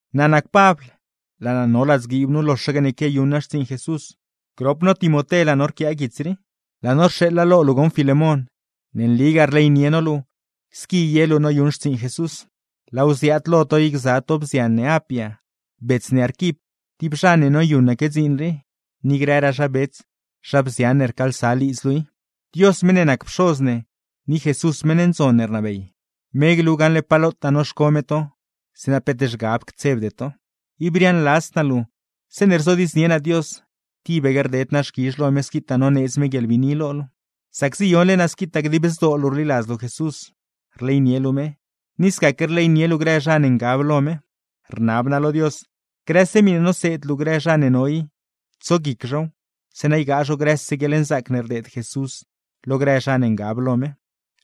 Naa nac Pabl, laa naa no ladzguiib nu loxaque ne quiayuṉ naa xtsiiṉ Jesús; grop no Timoté laa no rquia guits rii. Laa no rxeeḻa lo luu goṉ Filemón, ne nligaa rleynie no luu squi ye luu noyuṉ xtsiiṉ Jesús. Laaw ziaad lo to i gza to bzian ne Apia, bets ne Arquip tib zha ne noyuṉaque dziin rii, ni grëraa zha bets, zha bzian ne rcaalsa lidz luu i. Dios, meṉ ne nac Pxoz ne, ni Jesús meṉ ndzon ne rnabey, me glu gaṉle pa lotaa noxco me to, zeeṉa peet zhgab ctsebde to. Ib riaaṉladzd naa luu, zeeṉe rzodiidznie naa Dios, tibaque rded naa xquizh lo me squitaa noneedz me guieḻbiini lo luu. Sac ziyonle naa squitaa dib zdoo luu rliladz luu Jesús, rleynie luu me, ni scaque rleynie luu grë zha ne ngab lo me. Rnab naa lo Dios, grëse miṉe noseed luu grë zha ne no i, tsoguic zhow, zeeṉa ygaa zho grëse guieḻnzaac ne rdeed Jesús lo grë zha ne ngab lo me.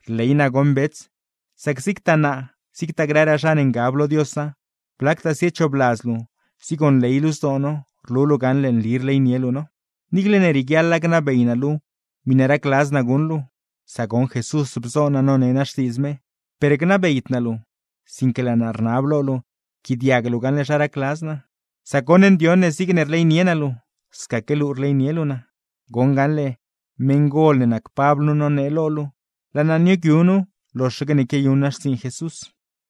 Rley naa goṉ bets, sac zigtaa naa zigtagaa grëraa zha ne ngab lo Diosa, blactaa ziechoobladz luu, zigonley luu zdoo no, rlu luu gaṉle nli rleynie luu no. Niicle ne rieguiaḻa gnabey naa luu miṉe racladz naa guṉ luu, sac goṉ Jesús bzo naa none naa Xtiidz me, per gnabeyd naa luu, sinque laa naa rnab lo luu yquiaadiag luu gaṉle zha racladz naa; sac goṉ ndioṉ ne zigne rleynie naa luu, scaque luu rleynie luu naa. (Goṉ gaṉle, meṉgol ne nac Pabl nu nonee lo luu, laa naa nioogyu nu loxaque ne quiayuṉ naa xtsiiṉ Jesús.)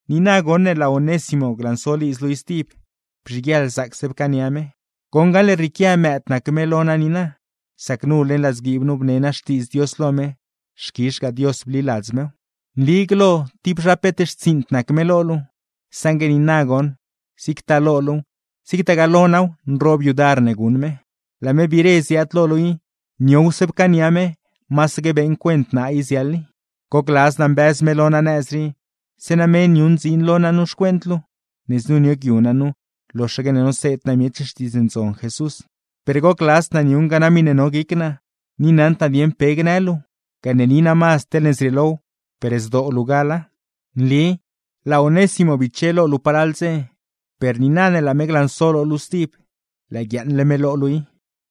Niina goṉ ne laa Onésimo glanso lidz luu i stib, bzhiguieḻ zaacse pcaania me, goṉ gaṉle rrieequia mëëd nac me lo naa niina, sac nu leṉ ladzguiib nu bne naa Xtiidz Dios lo me, xquizhgaa Dios bliladz mew. Nli glo tib zha peet xtsiiṉd nac me lo luu, saṉgue niina goṉ, zigtaa lo luuw zigtagaa lo naaw nroob yudar ne guṉ me. Laa me biire ziaad lo luu i, niowse pcaania me; masaque beeṉ cuent naa i ziaḻ i. Gocladz naa mbëz me lo naa nëz rii, zeeṉa me niuṉ dziin lo naa nu xcuent luu, ne znu nioogyu naa nu loxaque ne noseed naa miech Xtiidz Ndzon Jesús. Per gocladzd naa niuṉga naa miṉe no guic naa, ni naṉd naa dieṉ pe gnë luu; gane ni naa mazd teḻne zrieelow, per zdoo luu gala. Nli laa Onésimo biche lo luu palal dze; per niina ne laa me glanso lo luu stib, lëë guiaaṉle me lo luu i.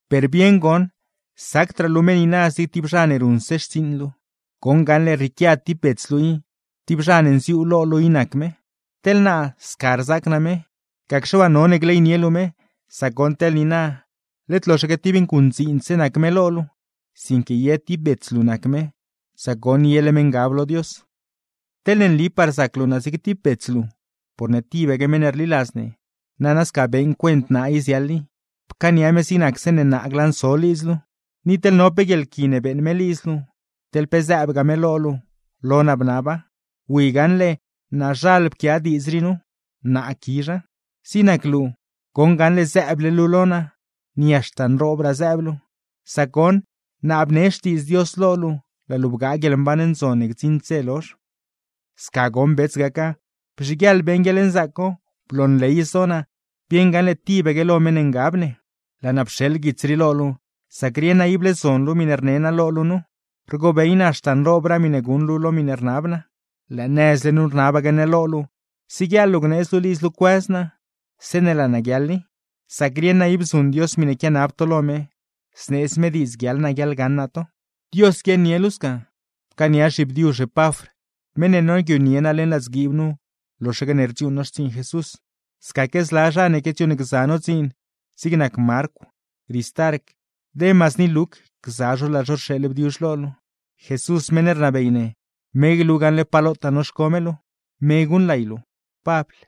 Per bieṉ goṉ, sacdraa luu me niina zig tib zha ne ruṉse xtsiiṉ luu, goṉ gaṉle rrieequia tib bets luu i, tib zha ne nziuu lo luu i nac me. Teḻ naa, sca rzaac naa me, gacxe waa none gleynie luu me; sac goṉ teḻ niina, led loxaque tib nguṉdziindse nac me lo luu, sinque ye tib bets luu nac me, sac goṉ yele me ngab lo Dios. Teḻne nlipaa rzac luu naa zig tib bets luu, porne tibaque meṉ ne rliladz ne, nana sca beeṉ cuent naa i ziaḻ i, pcaania me zig nac zeeṉe naa glanso lidz luu. Ni teḻ no pe guieḻqui ne beeṉ me lidz luu, teḻ pe zëëbgaa me lo luu, lo naa bnaba. Wi gaṉle, naazhal pquia diidz rii nu: Naa quizha. ¡Zig nac luu, goṉ gaṉle zëëble luu lo naa, ni haxta nroobraa zëëb luu! Sac goṉ, naa bnee Xtiidz Dios lo luu laa luu bgaa guieḻmban ndzon ne gdziṉd dze lozh. Sca goṉ bets gaca, bzhiguieḻ beeṉ guieḻnzaac co; bloonley zdoo naa, bieṉ gaṉle tibaque lo meṉ ne ngab ne. Laa naa pxeḻ guits rii lo luu, sac rieṉ naa ible zon luu miṉe rne naa lo luu nu, rgobey naa haxta nroobraa miṉe guṉ luu lo miṉe rnab naa. Lëë nëzle nu rnabaque naa lo luu, siguieḻ luu gneedz luu lidz luu cuëz naa zeeṉe laa naa guiaḻ i; sac rieṉ naa ib zuṉ Dios miṉe quianab to lo me, zneedz me diidz guiaḻ naa guiaḻgaṉ naa to. ¡Dios guiaaṉnie luu sca! Pcaania zhibdiuzh Epafr, meṉ ne nioogyunie naa leṉ ladzguiib nu loxaque ne rdziuuṉ no xtsiiṉ Jesús. Scaquegaa zla zha ne quiadziuuṉgza no dziin, zig nac Marcw, Ristarc, Demas ni Luc, gza zho laa zho rxeeḻ bdiuzh lo luu. Jesús meṉ ne rnabey ne, me glu gaṉle pa lotaa noxco me luu. ¡Me guṉlay luu! Pabl